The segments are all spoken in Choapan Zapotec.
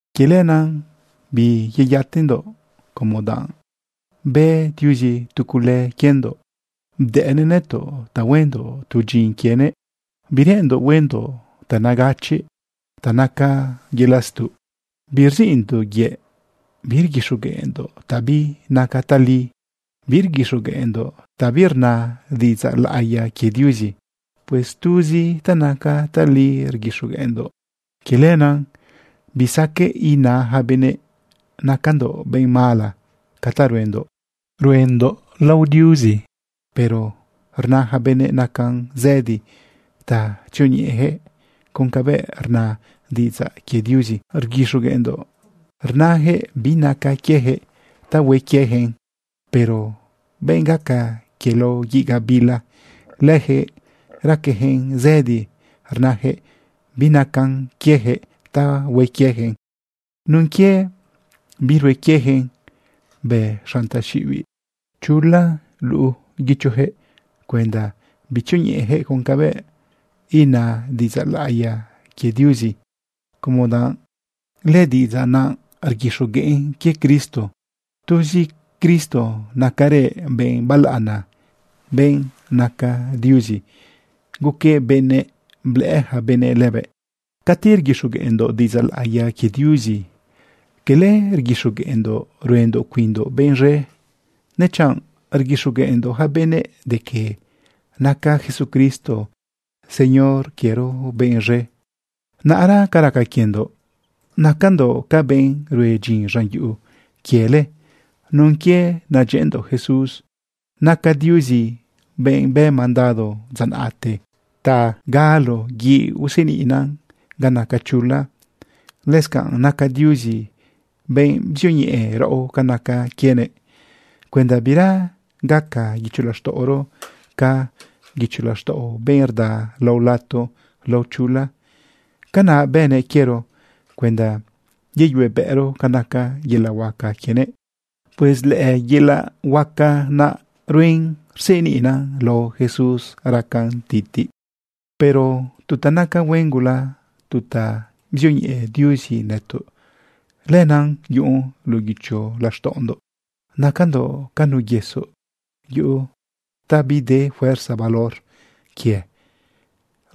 Quie lenaꞌ biyeyatendoꞌ como danꞌ bë Diuzi tu cule quiendoꞌ bdëꞌnëꞌ nëtoꞌ ta huendoꞌ tu dyin quienëꞌ. Bireꞌenndoꞌ huendoꞌ ta negachiꞌ ta naca yelaꞌ stuꞌ. Birziꞌndoꞌ yëꞌ. Birguixogueꞌndoꞌ ta binaca tali. Birguixogueꞌndoꞌ ta birna diꞌidzaꞌ laꞌiya quie Diuzi. Pues tuz ta naca tali rguixogueꞌndoꞌ. Quie lenaꞌ bisaqueꞌ ina ja benëꞌ nacandoꞌ benꞌ mala. Ca ta ruendoꞌ, ruendoꞌ lao Diuzi. Pero rna ja benëꞌ nacan zëdi ta tzioñeꞌejëꞌ con cabëꞌ rna diꞌidzaꞌ quie Diuzi rguixogueꞌndoꞌ. Rnajëꞌ binacan quiejëꞌ ta hue quieyaquëꞌn. Pero benꞌ gaca quie lao guiꞌ gabila, lëjëꞌ raquejëꞌn zëdi rnajëꞌ binacan quiejëꞌ ta hue quieyaquëꞌn. Nun quie birue quieyaquëꞌn, bë xanꞌ taxiꞌibiꞌ chula guichojëꞌ cuenda bitzioñeꞌejëꞌ con cabëꞌ ina diꞌidzaꞌ laꞌiya quie Diuzi, como danꞌ lëdiꞌidzaꞌ naꞌ rguixogueꞌn quie Cristo. Tuzi Cristo nacarëꞌ benꞌ balaꞌana, benꞌ naca Diuzi guquëꞌ benëꞌ, blëꞌë yaca benëꞌ lëbëꞌ. Cati rguixogueꞌndoꞌ diꞌidzaꞌ laꞌiya quie Diuzi, quele rguixogueꞌndoꞌ ruendoꞌ cuinndoꞌ benꞌ z̃e, dechanꞌ rguixogueꞌndoꞌ yaca benëꞌ de que naca Jesucristo Señor quiero benꞌ z̃e. Naꞌra ca raca quiendoꞌ nacandoꞌ ca benꞌ rue dyin z̃an yuꞌu quiele nun quie nadyëꞌëndoꞌ Jesús. Naca Diuzi benꞌ bë mandado dza naꞌte ta galo guiꞌ useniꞌna ga naca chula. Lëscanꞌ naca Diuzi benꞌ bzioñeꞌe raꞌo ca naca quienëꞌ cuenda bira gaca guicho laxtaꞌoro ca guicho laxtaꞌo benꞌ rda lao lato lao chula. Canaꞌ bënëꞌ quiero cuenda yeyuebëꞌro ca naca yelaꞌ huaca quienëꞌ. Pues lëyelaꞌ huaca naꞌruen rseniꞌna lao Jesús raca titiꞌn. Pero tu ta naca huen gula, tu ta bzioñeꞌe Diuzi nëtoꞌ, lenaꞌ yuꞌun luꞌu guicho laxtaꞌondoꞌ. Nacandoꞌ ca nu yesoꞌ yu ta bide fuerza valor quie.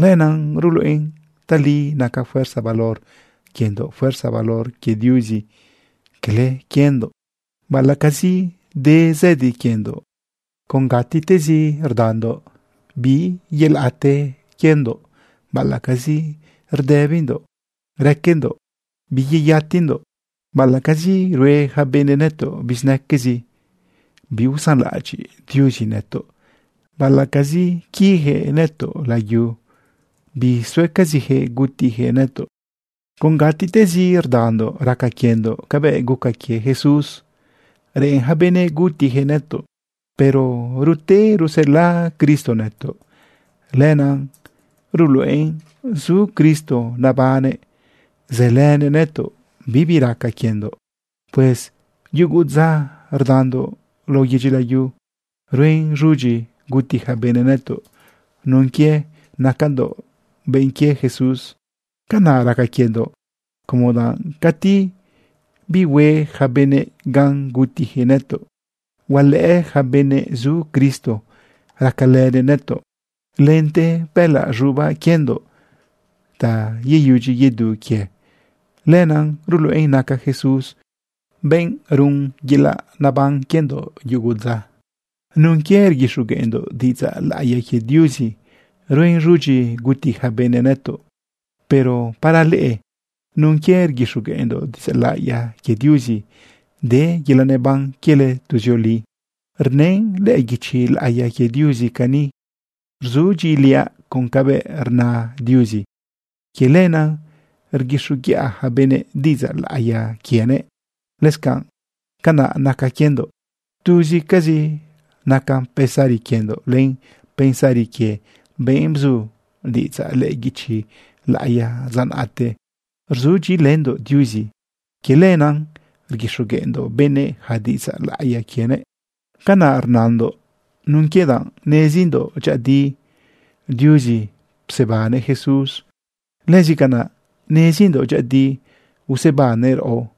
Lenaꞌ ruluꞌen tali naca fuerza valor quiendoꞌ fuerza valor quie Diuzi, cala quiendoꞌ. Baꞌalaꞌcazi de zëdi quiendoꞌ con gatiꞌ tezi rdandoꞌ, biyelaꞌte quiendoꞌ. Baꞌalaꞌcazi rdëbindoꞌ raquendoꞌ, biyeyatendoꞌ. Baꞌalaꞌcazi rue ja benëꞌ nëtoꞌ bizinaquezi, biusanlaꞌadyiꞌ Diuzi nëtoꞌ. Baꞌalaꞌcazi quijëꞌ nëtoꞌ layu, bisuecazijëꞌ gutijëꞌ nëtoꞌ. Con gatiꞌtezi rdandoꞌ raca quiendoꞌ cabëꞌ guca quie Jesús reꞌen ja benëꞌ gutijëꞌ nëtoꞌ. Pero rute rusela Cristo nëtoꞌ. Lenaꞌ ruluꞌen zu Cristo nebannëꞌ sëlënëꞌ nëtoꞌ, bibi raca quiendoꞌ. Pues yugu dza rdandoꞌ lao yedyi layu ruen z̃udyi guti ja benëꞌ nëtoꞌ nun quie nacandoꞌ benꞌ quie Jesús. Canaꞌ raca quiendoꞌ, como danꞌ cati bihue ja benëꞌ gan gutijëꞌ nëtoꞌ, hualëꞌë ja benëꞌ zu Cristo racalënëꞌ nëtoꞌ. Lente bëꞌëlaꞌ z̃ubaꞌ quiendoꞌ ta yeyudyi yedu quie, lenaꞌ ruluꞌen naca Jesús benꞌ run yelaꞌ neban quiendoꞌ yugu dza. Nun quie rguixogueꞌndoꞌ diꞌidzaꞌ laꞌiya quie Diuzi, ruen z̃udyi guti ja benëꞌ nëtoꞌ. Pero para leꞌe, nun quie rguixogueꞌndoꞌ diꞌidzaꞌ laꞌiya quie Diuzi, de yelaꞌ neban quiele tuzioli. Rnën lëꞌë guichi laꞌiya quie Diuzi cani: “Rzudyiꞌiliaꞌ con cabëꞌ rna Diuzi. Quie lenaꞌ rguixoguiꞌa ja benëꞌ diꞌidzaꞌ laꞌiya quienëꞌ.” Lëscanꞌ canaꞌ naca quiendoꞌ. Tuzcazi naca pensari quiendoꞌ len pensari quie benꞌ bzu diꞌidzaꞌ lëꞌë guichi laꞌiya dza naꞌte. Rzudyiꞌilëndoꞌ Diuzi. Quie lenaꞌ rguixogueꞌndoꞌ benëꞌ ja diꞌidzaꞌ laꞌiya quienëꞌ. Canaꞌ rnandoꞌ nun quie danꞌ nezindoꞌ dyëꞌëdi Diuzi psebannëꞌ Jesús. Lëscanaꞌ nezindoꞌ dyëꞌëdi usebannëꞌ raꞌo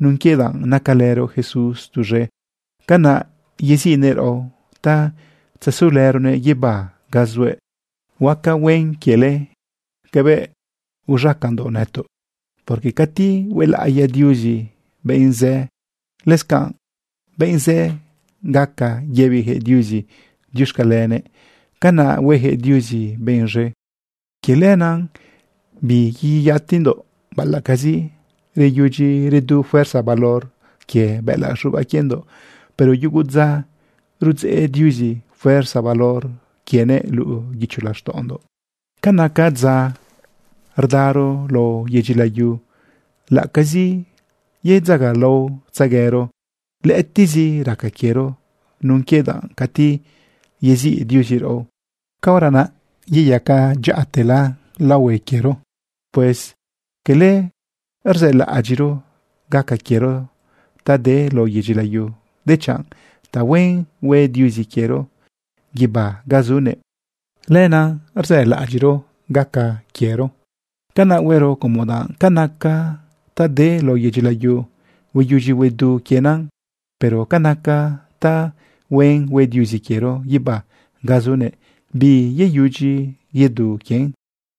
nun quie danꞌ nacalëro Jesús tuz̃e. Canaꞌ yeziꞌnëꞌ raꞌo ta tzesulëronëꞌ guibá ga zuëꞌ. Huaca huen quiele cabëꞌ uz̃acandoꞌ nëtoꞌ, porque cati huelaꞌiya Diuzi benꞌ zë, lëscanꞌ benꞌ zë gaca yëbijëꞌ Diuzi diuxcalenëꞌ. Canaꞌ huejëꞌ Diuzi benꞌ z̃e. Quie lenaꞌ biyeyatendoꞌ. Baꞌalaꞌcazi reyudyi redu fuerza valor quie bëꞌëlaꞌ z̃ubaꞌ quiendoꞌ, pero yugu dza rudzeꞌ Diuzi fuerza valor quienëꞌ luꞌu guicho laxtaꞌondoꞌ. Ca naca dza rdaro lao yedyi layu, laꞌacazi yedzagalaotzeguero, lëꞌëtiꞌzi raca quiero nun quie danꞌ cati yeziꞌ Diuzi raꞌo, caora naꞌ yeyaca dyaꞌa te tela laohue quiero. Pues cala rzëlaꞌadyiꞌro gaca quiero ta de lao yedyi layu, dechanꞌ tahuen hue Diuzi quiero guibá ga zunëꞌ, lenaꞌ rzëlaꞌadyiꞌro gaca quiero. Canaꞌ huero como danꞌ ca naca ta de lao yedyi layu, hueyudyi huedu quien, pero ca naca tahuen hue Diuzi quiero guibá ga zunëꞌ, biyeyudyi biyedu quien.